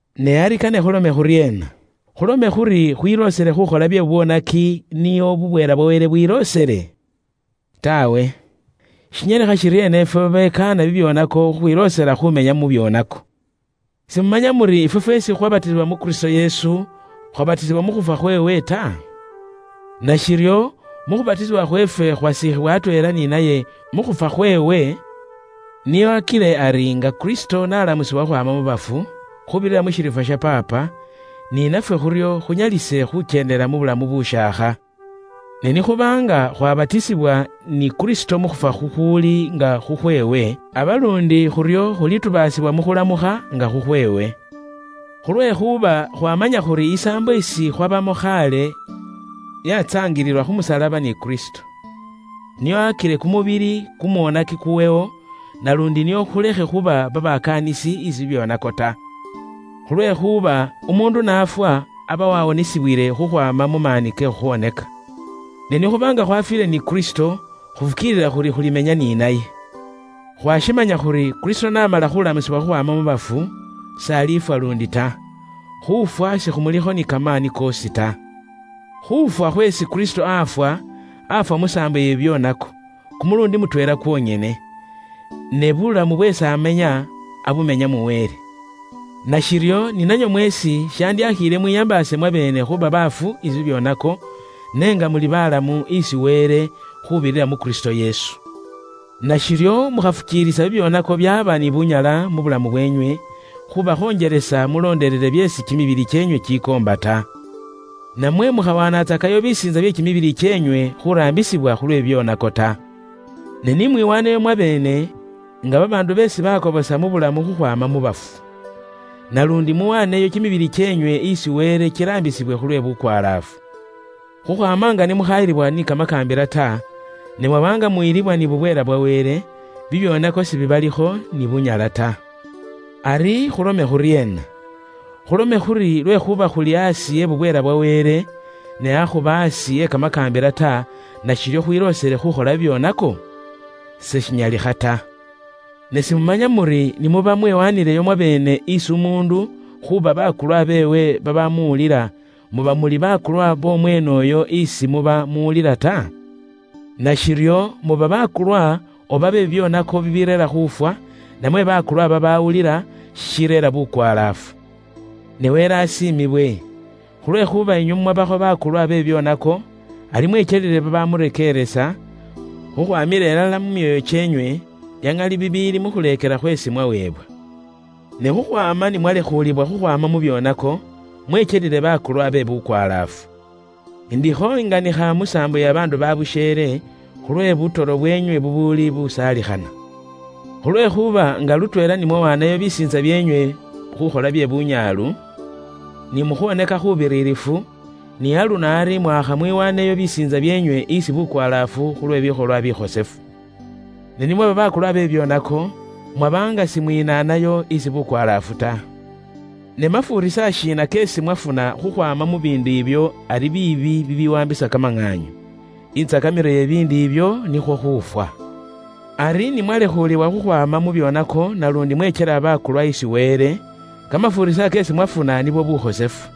Ne ari kane khulome khuryeena? Khulome khuri khwiloosele khuukhola bye bubwoonaki nio bubweela bwa Wele bwiloosele? Taawe. Shinyalikha shiryeena ifwe babekaana bibyoonako khukhwiloosela khuumenya mu byoonako? Simumanya muri ifwe fweesi khukhwabatisibwa mu Kristo Yesu, khwabatisibwa mu khufwa khweewe ta? Nashiryo mu khubatisibwa khweefwe khwasiikhibwa atweela ni naye mu khufwa khweewe, nio akile ari nga Kristo n'alamusibwa khukhwaama mu bafu khuubirira mu shiriifwa sha Paapa, ni nafwe khuryo khunyalise khukyendela mu bulamu bushaakha. Ne ni khuba nga khwatubaasibwa ni Kristo mu khufwa khukhuuli nga khukhweewe, aba luundi khuryo khulitubaasibwa mu khulamukha nga khukhweewe. Khulwekhuuba khwaamanya khuri isaambo isi khwabamo khaale yatsaangiliwa khu musalaba ni Kristo. Nio akile kumubili kumwoonaki kuwewo, naluundi nio khulekhe khuuba babakaanisi isi bibyoonako ta. Khulwekhuuba umuundu n'afwa aba wawonisibwile khukhwaama mu maani ke khukhola bye bubwoonaki. Ne ni khuba nga khwafiile ni Kristo, khufukiilila khuri khulimenya ni naye. Khwaashimanya khuri Kristo n'amala khuulamusibwa khukhwaama mu bafu, s'alifwa luundi ta. Khuufwa sikhumulikho ni kamaani koosi ta. Khuufwa khweesi Kristo aafwa, aafwa musaambo iye bibyoonako, kumuluundi mutweela kwonyene. Ne buulamu bweesi amenya, abumenya mu Wele. Nashiryo ni nanywe mweesi shandyashiile mwiyambaase mwabeene khuuba baafu isi bibyoonako, ne nga muli balamu isi Wele, khuubirira mu Kristo Yesu. Nashiryo mukhafukiilisa bibyoonako byaaba ni bunyala mu bulamu bweenywe, khuubakhonjelesa mulondelele byeesi kimibili kyeenywe kikoomba ta. Namwe mukhawanatsakayo bisiintsa bye kimibili kyeenywe khuuraambisibwa khulwe bubwoonaki ta. Ne ni mwiwaaneyo mwabeene nga babaandu beesi bakobosa mu bulamu khukhwaama mu bafu. Naluundi muwaaneyo kimibili kyeenywe isi Wele kiraambisibwe khulwe bukwalaafu. Khukhwaama nga ni mukhayilibwa ni kamakaambila ta, ne mwaba nga muyilibwa ni bubweela bwa Wele, bibyoonako sibibalikho ni bunyala ta. Ari khulome khuryeena? Khulome khuri lwekhuuba khuli aasi e bubweela bwa Wele, ne akhuba aasi e kamakaambila ta, nashiryo khwiloosele khukhola bibyoonako? Seshinyalikha ta. Ne simumanya muri ni muba mwewanileyo mwabeene isi umuundu khuuba bakulwa beewe babamuwulila, muba muli bakulwa bomweene uyo isi muba muwulila ta? Nashiryo muba bakulwa oba be bibyoonako bibireera khufwa, namwe bakulwa babawulila, shishireera bukwalaafu. Ne Wele asiimibwe! Khulwekhuuba inywe mumwabakho bakulwa be bibyoonako, ari mwekyelile babamurekeeresa, khukhwamila ilala nga mushiili munda, mu myoyo kyeenywe, bya ŋali bibiili mu khuleekela khweesi mwaweebwa. Ne khukhwaama ni mwalekhuulibwa khukhwaama mu byoonako, mwekyelile bakulwa be bukwalaafu. Indikho inganikha mu saambo iye babaandu babusheele, khulwe butoro bwenywe bubuuli busaalikhana. Khulwekhuuba nga lutweela ni mwawaanayo bisiintsa byeenywe khuukhola bye bunyaalu, ni mu khwoonaka khuubiririfu, ni aluno ari mwaakha muwaaneyo bisiintsa byeenywe isi bukwalaafu khu lwe bikholwa bikhosefu. Ne ni mwaba bakulwa be bibyoonako, mwaba nga simwinaanayo isi bukwalaafu ta. Ne mafuurisa shiina keesi mwafuna khukhwaama mu biindu ibyo ari biibi bibiwaambisa kamaŋaanyu? Intsakamilo iye bibiindu ibyo nikhwo khuufwa. Ari ni mwalekhuulibwa khukhwaama mu byoonako naluundi mwekyela bakulwa isi Wele, kamafuurisa keesi mwafuna nibwo bulamu bubuwaanibwilayo ilala isi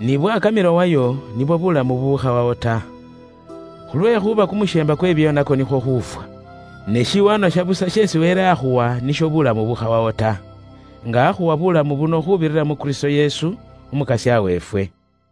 niye. N'ibwakamilo wayo, nibwo bulamu bubukhawawo ta. Khulwekhuuba kumusheemba kwe bibyoonako nikwo khuufwa. Ne shiwaanwa sha busa sheesi Wele akhuwa nisho buulamu bubukhawawo ta, nga akhuwa buulamu buno khuubirira mu Kristo Yesu, Umukasya weefwe.